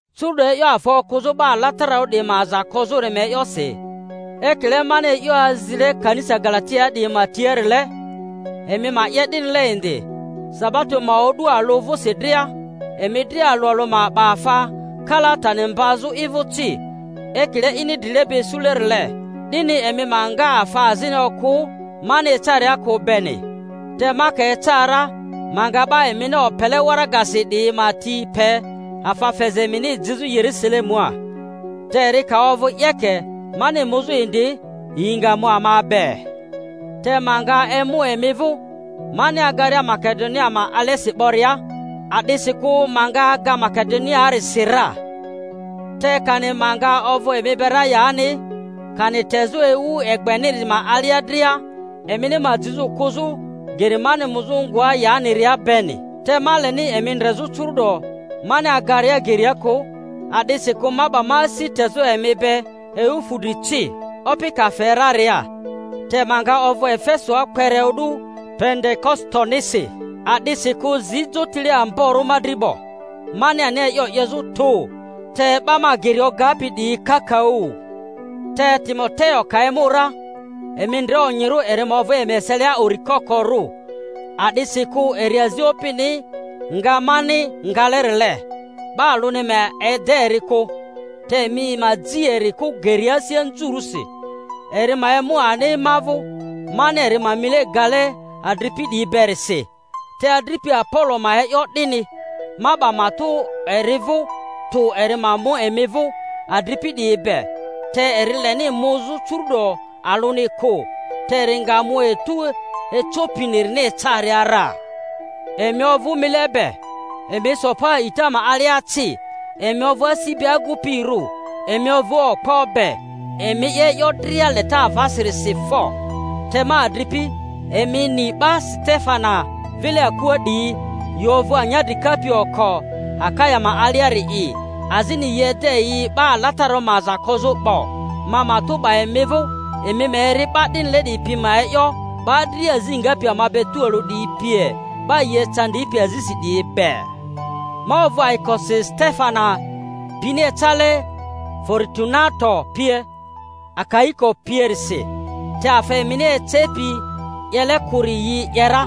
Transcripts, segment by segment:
Curu'do, e'yo afa okᴜzᴜ 'ba alatararᴜ 'diyi ma aza kozᴜri ma e'yosi: ekile mani e'yo azile kanisa Galatiaa 'diyi ma tiarile, emi ma 'ye 'dinile indi. Sabato ma o'du alᴜ vᴜsi dria, emi dria alᴜ alᴜ ma 'ba afa kalaa tani mbazᴜ i vᴜ ci, ekile ini drileba isulerile, 'dini emi ma nga afa azini okᴜ mani ecaria kᴜ beni. Te ma ka eca ra, ma nga 'ba emini opele waragasi 'diyi ma ti pe afa feza emini jizᴜ Yerusalemua. Te eri ka ovᴜ 'yeke mani muzᴜ indi, yi nga mu ama be. Te ma nga emu emi vᴜ, mani agaria Makedonia ma alesi 'boria, a'disikᴜ ma nga aga Makedoniaarisi ra, te kani ma nga ovᴜ emi be ra yani, kani tezᴜ ewu egbeniri ma alia dria, emini ma jizᴜ kᴜzᴜ geri mani muzᴜ ngoa yaniria beni. Te ma leni emi ndrezᴜ curu'do mani agaria geria kᴜ; a'disikᴜ ma 'ba ma asi tezᴜ emi be ewu fudri ci, Opi ka fe raria. Te ma nga ovᴜ Efesoa kpere o'du Pentekositonisi, a'disikᴜ zi jotile amborᴜ ma dri 'bo, mani ani e'yo 'yezᴜ tᴜ, te 'ba ma geri ogapi 'diyi yi kakaᴜ. Te Timoteo ka emu ra, emi ndre onyirᴜ eri ma ovᴜ emi eselia uri kokorᴜ, a'disikᴜ eri azi Opini nga mani ngalerile. 'Ba alᴜni ma ede eri kᴜ. Te emi ma ji eri kᴜ geria asi anzurᴜsi, eri ma emu ani ma vᴜ; mani eri ma mile gale adripi 'diyi berisi. Te adripi Apolo ma e'yo 'dini, ma 'ba matᴜ eri vᴜ tᴜ eri ma mu emi vᴜ adripi 'diyi be, te eri leni muzᴜ curu'do alᴜni kᴜ. Te eri nga mu etu ecopirini ecaria ra. Emi ovᴜ mile be, emi so pa a'ita ma alia ci, emi ovᴜ asi be agu-pirᴜ, emi ovᴜ okpo be. Emi 'ye e'yo dria leta avasirisi fo! Te ma adripi, emi ni 'ba Setefana vile akua 'diyi, yi ovᴜ anyadri kapi oko Akaya ma aliari'i, azini yi ede yi 'ba alatararᴜ ma aza kozᴜ 'bo; ma matᴜ 'ba emi vᴜ, emi ma eri 'ba 'dinile 'diyi pi ma e'yo, 'ba dria azi ngapi ama be tualᴜ 'diyi pie, 'ba yi ecandipi azisi 'diyi be. Ma ovᴜ ayikosi Setefana pini ecale, Foritunato pie, Akaiko pierisi, te afa emini ecepi 'yele kᴜri yi 'ye ra,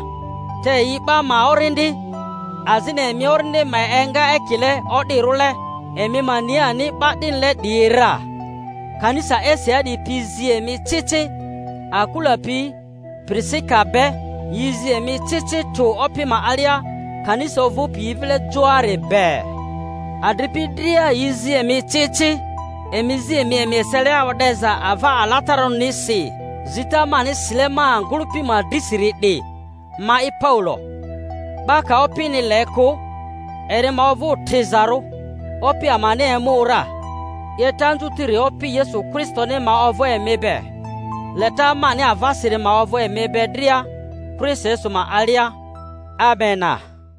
te yi 'ba ma orindi, azini emi orindi ma enga ekile o'dirᴜle. Emi ma ni ani 'ba 'dinile 'diyi ra. Kanisa Asiaa 'diyi yi zi emi ci ci. Akula pi Pirisika be yi zi emi ci ci tᴜ Opi ma alia, kanisa ovᴜpi yi vile joari be. Adripi dria yi zi emi ci ci. Emi zi emi emi eselia o'deza ava alatararᴜnisi. Zita mani sile ma ngᴜlᴜpi ma drisiri 'di, ma'i Paulo. 'Ba ka Opini le kᴜ, eri ma ovᴜ trizarᴜ. Opi amani emu ra! 'Yeta anzutiri Opi Yesu Kristoni ma ovᴜ emi be. Leta mani avasiri ma ovᴜ emi be dria Kristo Yesu ma alia. Amena.